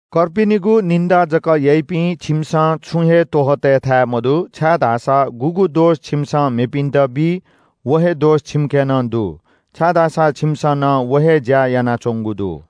कर्पिनिगु निन्‍दा जक याइपिं छिमिसं छुं हे त्‍वहः तय्‌थाय् मदु, छाय्‌धाःसा गुगु दोष छिमिसं मेपिन्‍त बी, व हे दोष छिमिके नं दु, छाय्‌धाःसा छिमिसं नं व हे ज्‍या यानाच्‍वंगु दु।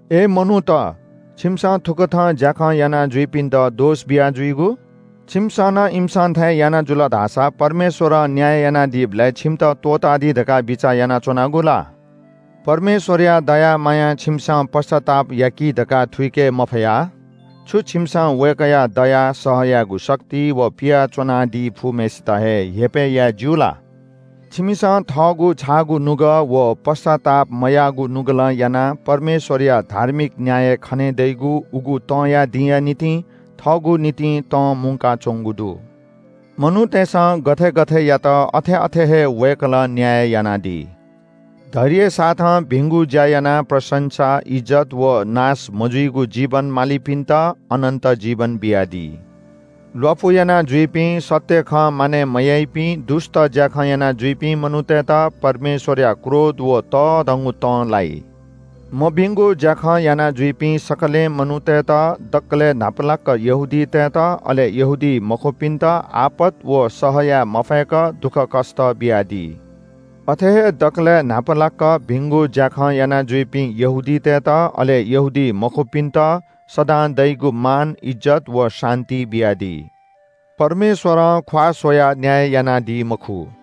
अय् मनूत, छिमिसं थुकथं ज्‍याखँ यानाजुइपिन्‍त दोष बियाजुइगु? छिमिसं नं इमिसं थें याना जुल धाःसा परमेश्‍वरं न्‍याय यानादीबलय् छिमित त्‍वःतादी धकाः बिचाः यानाच्‍वनागु ला? परमेश्‍वरया दया मायां छिमिसं पश्‍चाताप याकी धकाः थुइके मफया, छु छिमिसं वय्‌कःया दया, सह यायेगु शक्ति व पिया च्‍वनादी फुम्‍हय्‌सित हे हेपय् याये ज्‍यू ला? छिमिसं थःगु छाःगु नुगः व पश्‍चात्ताप मयाःगु नुगलं यानाः परमेश्‍वरया धार्मिक न्‍याय खने दइगु उगु तंया दिंया निंतिं थःगु निंतिं तं मुंका च्‍वंगु दु। मनूतय्‌सं गथे गथे यात अथे अथे हे वय्‌कलं न्‍याय यानादी। धैर्यसाथं भिंगु ज्‍या यानाः प्रशंसा, इज्‍जत व नाश मजुइगु जीवन मालीपिन्‍त अनन्‍त जीवन बियादी। ल्‍वापु यानाजुइपिं, सत्‍य खँ मानय् मयाइपिं, दुष्‍ट ज्‍याखँ यानाजुइपिं मनूतय्‌त परमेश्‍वरया क्रोध व तःधंगु तं लाइ। मभिंगु ज्‍याखँ यानाजुइपिं सकलें मनूतय्‌त दकलय् न्‍हापालाक यहूदीतय्‌त अले यहूदीमखुपिन्‍त आपत व सह याये मफय्‌क दुःखकष्‍ट बियादी। अथे हे दकलय् न्‍हापालाक भिंगु ज्‍याखँ यानाजुइपिं यहूदीतय्‌त, अले यहूदीमखुपिन्‍त सदां दइगु मान, इज्‍जत व शान्‍ति बियादी। परमेश्‍वरं ख्‍वाः स्‍वयाः न्‍याय यानादी मखु।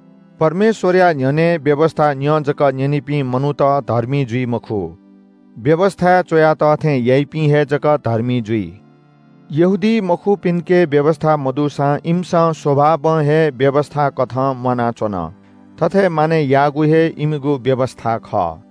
परमेश्‍वरया न्‍ह्यःने व्‍यवस्‍था न्‍यँ जक न्‍यनीपिं मनूत धर्मी जुइ मखु, व्‍यवस्‍थाय् च्‍वया तः थें याइपिं हे जक धर्मी जुइ। यहूदीमखुपिन्‍के व्‍यवस्‍था मदुसां इमिसं स्‍वभावं हे व्‍यवस्‍थाकथं म्‍वानाच्‍वन। थथे मानय् याःगु हे इमिगु व्‍यवस्‍था खः।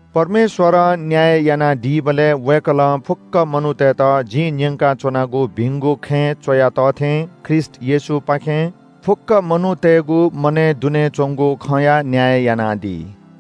परमेश्‍वरं न्‍याय यानादीबलय् वय्‌कलं फुक्‍क मनूतय्‌त जिं न्‍यंकाच्‍वनागु भिंगु खँय् च्‍वया तः थें ख्रीष्‍ट येशूपाखें फुक्‍क मनूतय्‌गु मनय् दुने च्‍वंगु खँया न्‍याय यानादी।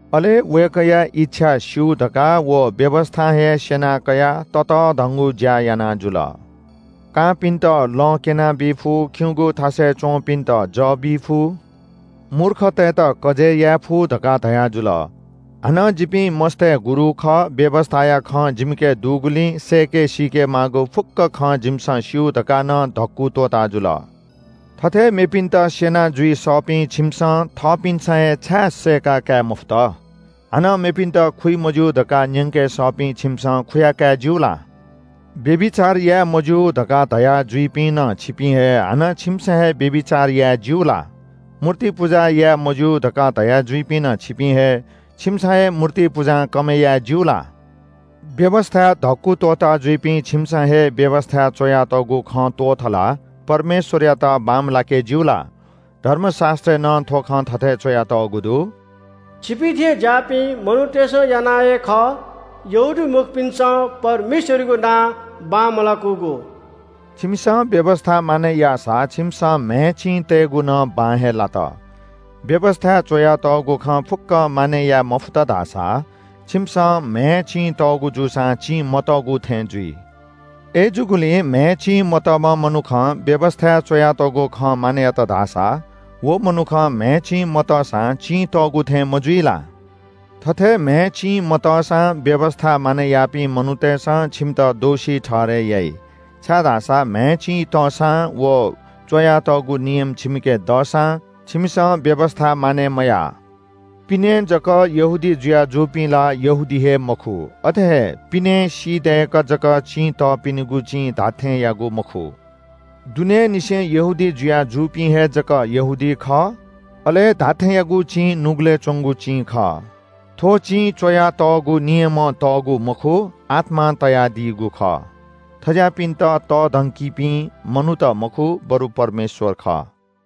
अले “वय्‌कःया इच्‍छा स्‍यू धकाः व व्‍यवस्‍थां हे स्‍यना कयाः ततःधंगु ज्‍या याना जुल। कांपिन्‍त लँ क्‍यनाबी फु, खिउँगु थासय् च्‍वंपिन्‍त जः बी फु, मूर्खतय्‌त कजय् याये फु” धकाः धयाजुल। हानं “जिपिं मस्‍तय् गुरु खः, व्‍यवस्‍थाया खँ जिमिके दुगुलिं सय्‌के सीके माःगु फुक्‍क खँ जिमिसं स्‍यू” धकाः नं धक्‍कु त्‍वःता जुल। थथे मेपिन्‍त स्‍यना जुइ सःपिं छिमिसं थःपिन्‍सं हे छाय् सय्‌काकाये मफुत? हानं मेपिन्‍त खुइ मज्‍यू धकाः न्‍यंके सःपिं छिमिसं खुयाकाये ज्‍यू ला? व्‍यभिचार याये मज्‍यू धकाः धयाजुइपिं नं छिपिं हे, हानं छिमिसं हे व्‍यभिचार याये ज्‍यू ला? मूर्ति पुजा याये मज्‍यू धकाः धयाजुइपिं नं छिपिं हे, छिमिसं हे मूर्ति पुजां कमय् याये ज्‍यू ला? व्‍यवस्‍थाय् धक्‍कु त्‍वःता जुइपिं छिमिसं हे व्‍यवस्‍थाय् च्‍वयातःगु खँ त्‍वाथलाः परमेश्‍वरयात बांमलाके ज्‍यू ला? धर्मशास्‍त्रय् नं थ्‍व खँ थथे च्‍वयातःगु दु – “छिपिं थें ज्‍याःपिं मनूतय्‌सं यानाः हे खः, यहूदीमखुपिन्‍सं परमेश्‍वरयागु नां बांमलाकूगु।” छिमिसं व्‍यवस्‍था मानय् याःसा छिमिसं म्‍हय् चिं तय्‌कूगु नं बां हे लात। व्‍यवस्‍थाय् च्‍वयातःगु खँ फुक्‍कं मानय् याये मफुत धाःसा छिमिसं म्‍हय् चिं तःगु जूसां चिं मतःगु थें जुइ। अय्‌जूगुलिं म्‍हय् चिं मतःम्‍ह मनुखं व्‍यवस्‍थाय् च्‍वयातःगु खँ मानय् यात धाःसा व मनुखं म्‍हय् चिं मतःसां चिं तःगु थें मजुइ ला? थथे म्‍हय् चिं मतःसां व्‍यवस्‍था मानय् याःपिं मनूतय्‌सं छिमित दोषी ठहरय् याइ, छाय्‌धाःसा म्‍हय् चिं तःसां व च्‍वयातःगु नियम छिमिके दःसां छिमिसं व्‍यवस्‍था मानय् मयाः। पिनें जक यहूदी जुया जूपिं ला यहूदी हे मखु। अथे हे पिनें सी दय्‌कः जक चिं तःपिनिगु चिं धात्‍थेंयागु मखु। दुनेंनिसें यहूदी जुया जूपिं हे जक यहूदी खः। अले धात्‍थेंयागु चिं नुगलय् च्‍वंगु चिं खः। थ्‍व चिं च्‍वयातःगु नियमं तःगु मखु, आत्‍मां तयादीगु खः। थज्‍याःपिन्‍त तःधंकीपिं मनूत मखु, बरु परमेश्‍वर खः।